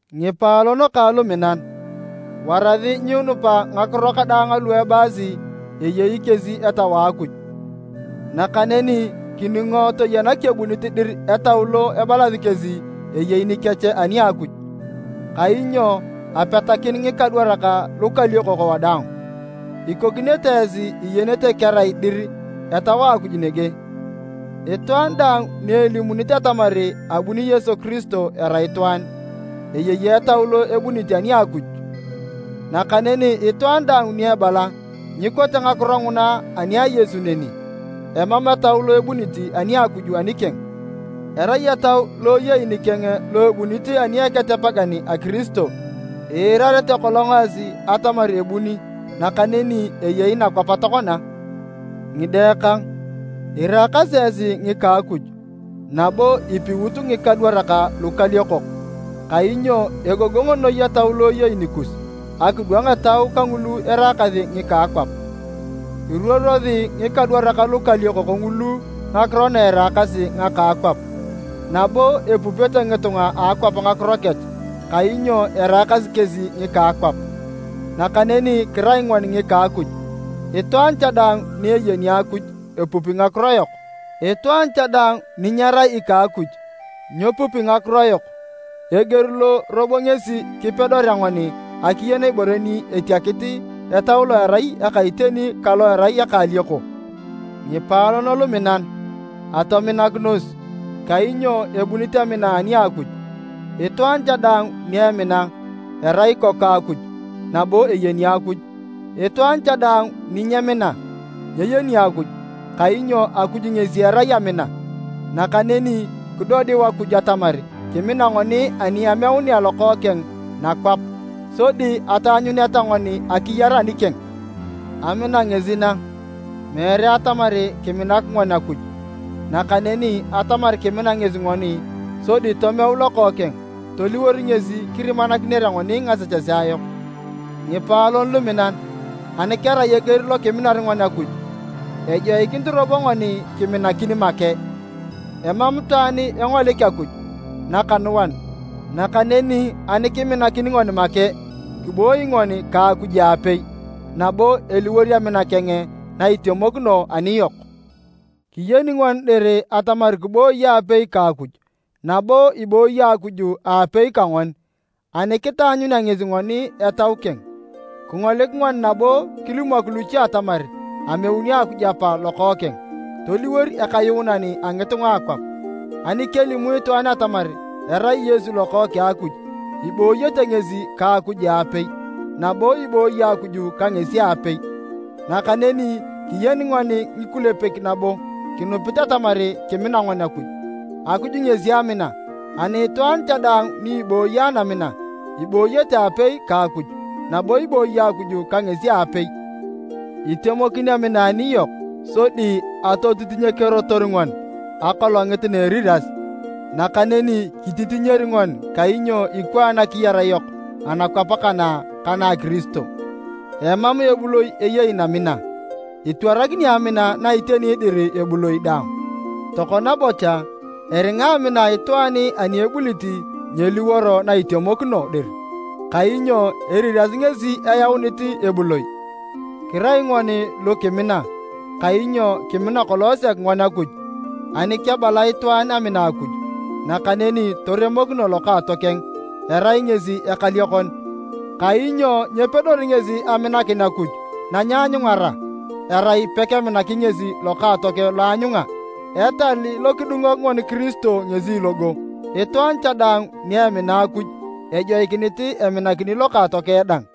Ngipaalon kang luminan, warasi nyiinupa ngakiro kadaang alu ebalasi eyei kesi Etau a Akuj, nakaneni kiningo toyena kebunit dir etau lo ebalasi kesi eyei nikech ani a Akuj. Kainyo apetakin ngikadwarak lukaliokok wadaang. Ikokinete esi iyenete kerai dir Etau a Akuj nege, itwaan daang ni elimunit atamar abuni Yesu Kiristo erai itwaan, eyei Etau lo ebunit ani a Akuj. Nakaneni itwaan daang ni ebala nyikote ngakiro nguna ani a Yesu neni, emam Etau lo ebunit ani a Akuj anikeng. Erai etau lo eyei nikeng lo ebunit ani a Eketepegan a Kiristo, iirarete kolong esi atamar ebuni nakaneni eyei nakwap tokona. Ngide kang, iraakasi esi ngika Akuj, nabo ipiut ngikadwarak lukaliokok kainyo egogong noi Etau lo eyei nikus akidwang etau kangulu eraakasi ngika akwap. Iruorosi ngikadwarak lukaliokok ngulu ngakiro na eraakasi ngaka akwap, nabo epupete ngitunga a akwap ngakiro kech kainyo eraakasi kesi ngika akwap. Nakaneni kirai ngoni ngika Akuj. Itwaan cha daang ni eyeni Akuj epupi ngakiro yok, itwaan cha daang ni nyerai ika Akuj, nyepupi ngakiro yok. Eger lo robo ngesi kipedorea ngoni akiyen ibore ni etiakit Etau lo erai eka iteni ka lo erai eka alioko. Ngipaalon luminan, atominakinos, kainyo ebunit amina ani a Akuj. Itwaan cha daang ni emina, erai ikoku a Akuj nabo eyeni Akuj. Itwaan cha daang ni nyemina, nyeyeni Akuj kainyo Akuj ngesi erai amina. Nakaneni kidodiu Akuj atamar kimina ngoni ani ameunea Lokookeng nakwap, sodi ataanyuneta ngoni akiyar anikeng. Amina ngesi na, meere atamar kiminak ngoni Akuj, nakaneni atamar kimina ngesi ngoni sodi tomeu Lokookeng toliwor ngesi kirimakinere ngoni ngasechesea yok. Ngipaalon luminan, ani kerai eger lo kiminar ngoni Akuj, ejoikinit robo ngoni kiminakin make. Emam itwaan engolik Akuj nakanuan, nakaneni ani kiminakin ngoni make, kiboi ngoni ka Akuj aapei, nabo eliwor amina keng na itemokino aniyok. Kiyeni ngoni dir atamar kiboi aapei ka Akuj nabo iboi Akuj aapei ka ngoni, ani kitaanyunea ngesi ngoni Etau keng. Kingolik ngoni nabo kilimok luche atamar ameuni Akuj Apa Lokookeng toliwor Ekayuunan a ngitunga a akwap. Ani kelimu itwaan atamar erai Yesu Lokookeng a Akuj, ibooyete ngesi ka Akuj aapei nabo ibooyi Akuj ka ngesi aapei. Nakaneni kiyeni ngoni ngikulepek nabo kinupit atamar kimina ngoni Akuj. Akuj ngesi amina, ani itwaan cha daang ni ibooyi anamina ibooyete aapei ka Akuj nabo ibooyi Akuj ka ngesi aapei. Itemokin amina aniyok sodi atotitinyikerotor ngoni Akolongit na Eriras, nakaneni kititinyer ngoni kainyo ikwaan akiyar yok anakwap kana ka na a Kiristo. Emam ebuloi eyei namina, itwarakini amina na iteni dir ebuloi daang. Tokona bocha, eringa amina a itwaan ani ebulit nyeliworo na itemokino dir, kainyo eriras ngesi eyaunit ebuloi. Kirai ngoni lu kimina kainyo kimina kolong sek ngoni Akuj. Ani kebala itwaan amina Akuj, nakaneni toremokino lokaatokeng, erai ngesi ekaliokon. Kainyo nyepedori ngesi aminakin Akuj na nyeanyungara, erai pekemina ngesi lokaatokeng lo aanyunga. Etal lo kidungok ngoni Kiristo ngesi logo, itwaan cha daang ni emina Akuj ejoikinit eminakini lokaatokeng dang.